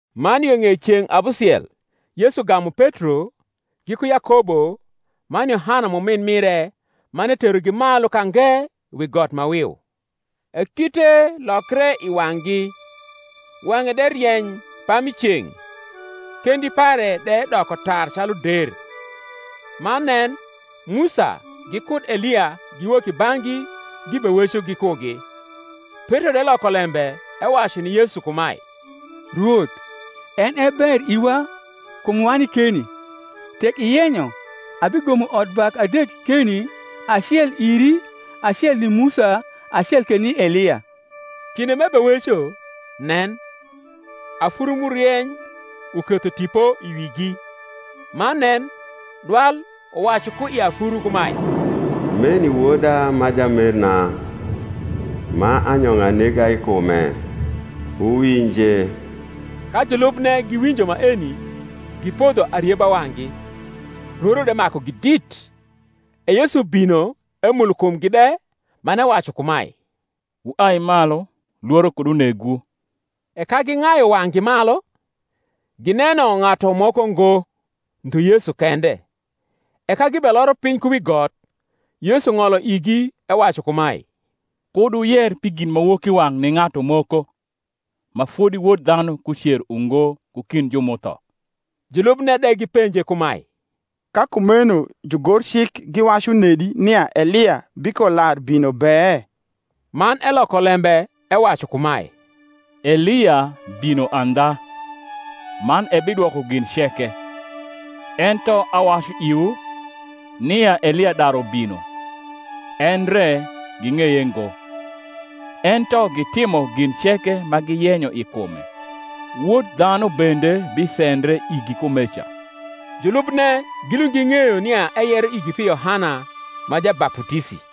Man yo ng’ei ceng’ abusiel Yesu gamu Petro, giku Yakobo, man Yohana m’umin mire; man eterogi malu ka nge wi got ma wiu: e kite lokre i wang’gi; wang’e de rieny pami ceng’, kendi pare de doko tar calu der. Man nen, Musa gikud Elia giwok i bang’gi gibeweco gikugi. Petro de loko lembe, ewacu ni Yesu kumae, Rwoth, en e ber iwa kum wani keni: tek iyenyo, abigomo odbak adek keni; acel iri, acel ni Musa, acel ke ni Elia. Kinde m’ebeweco, nen, afuru m’urieny uketho tipo i wigi: man nen, dwal uwacu ku i afuru kumae, Meni Woda ma jamerna, ma anyong’a nega i kume; wuwinje. Ka julubne giwinjo maeni, gipodho arieba wang’gi, lworo de makugi dit. E Yesu bino emulo kumgi de man ewacu kumae, Wuai malu, lworo kud unegwu. E ka ging’ayu wang’gi malu, gineno ng’atu moko ngo, ndhu Yesu kende. E ka gibeloro piny ku wi got, Yesu ng’olo igi, ewacu kumae, Kud wuyer pi ginmawokiwang’ ni ng’atu moko, ma fodi Wod dhanu kucer ungo ku kind ju m’utho. Julubne de gipenje kumae, Ka kumeno jugorcik giwacu nedi nia Elia bikolarbino be? Man eloko lembe ewacu kumae, Elia bino andha, man ebidwoko gin ceke: ento awacu iwu, nia Elia daru bino, endre ging’eye ngo, ento gitimo gin ceke ma giyenyo i kume. Wod dhanu bende bisendre igi kumeca. Julubne gilund ging’eyo nia eyero igi pi Yohana ma Jabaputisi.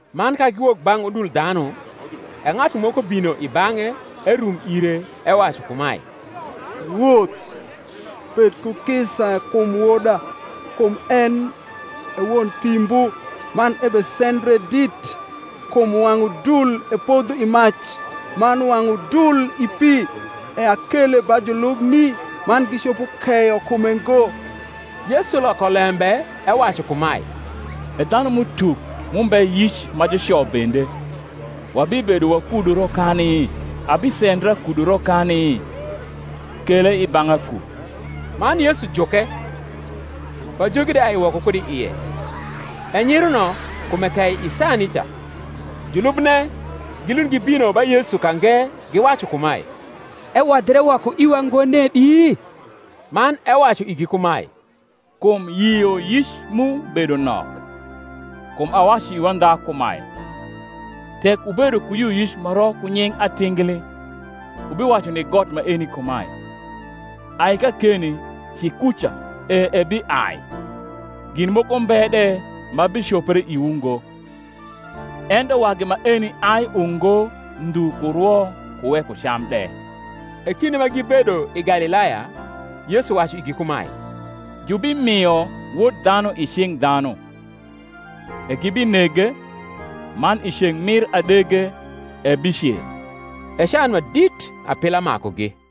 Man ka giwok bang’ udul dhanu, e ng’atu moko bino i bang’e, erum ire, ewacu kumae, Rwoth, bed ku kisa kum woda: kum en e won thimbu, man ebesendre dit; kum wang’ udul epodho i mac, man wang’ udul i pi. E akele ba jniubni, man gicopo keyo kume ngo. Yesu loko lembe ewacu kumae, E dhanum’utuk m’umbe yic ma juco bende, wabibedo wakudu rokani? abisendra kudu rokani? kele i bang’a ku. Man Yesu juke; pajogi de ai woko kud i ie: e nyiruno kume kei i saa nica. Julubne gilund gibino ba Yesu ka nge, giwacu kumae, Ewodhre woko iwa ngo nedi? Man ewacu igi kumae, Kum yioyic mu bedo nok: kum awacu iwu andha kumae, Tek wubedo ku yioyic ma ro ku nying atingli, wubiwacu ni got maeni kumae, Ai kakeni ci kuca; e ebiai: gin moko mbe de ma bicopre iwu ngo. Ento wagi maeni ai ungo ndhu ku rwo ku weko cam de. E kinde ma gibedo i Galilaya Yesu wacu igi kumae, Jubimio Wod dhanu i cing’ dhanu: e gibinege, man i ceng’ mir adege ebicer. E can ma dit apila makugi.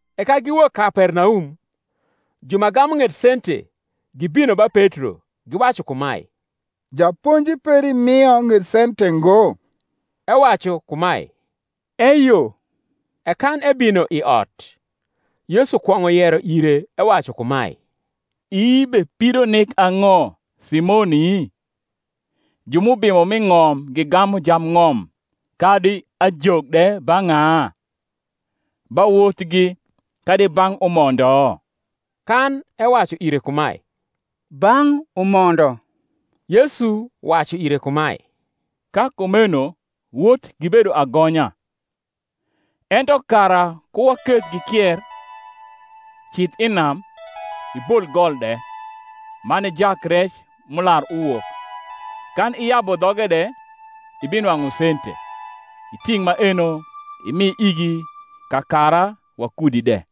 E ka giwok Kapernaum, ju ma gamu ng’et sente gibino ba Petro, giwacu kumae, Japonji peri rnio ng’et sente ngo? Ewacu kumae, Eyo. E kan ebino i ot, Yesu kwong’o yero ire, ewacu kumae, Ii bepido nik ang’o, Simoni? ju m’ubimo m’i ng’om gigamu jambng’om kadi ajok de ba ng’a? ba wotgi, kadi bang’ umondo? Kan ewacu ire kumae, Bang’ umondo, Yesu wacu ire kumae, Ka kumeno wot gibedo agonya. Ento kara ku waketh gikier, cidh i nam, ibol gol de, man ijak rec m’ular uwok; kan iyabu dhoge de, ibinwang’u sente; iting’ maeno, imi igi kakara wakudi de.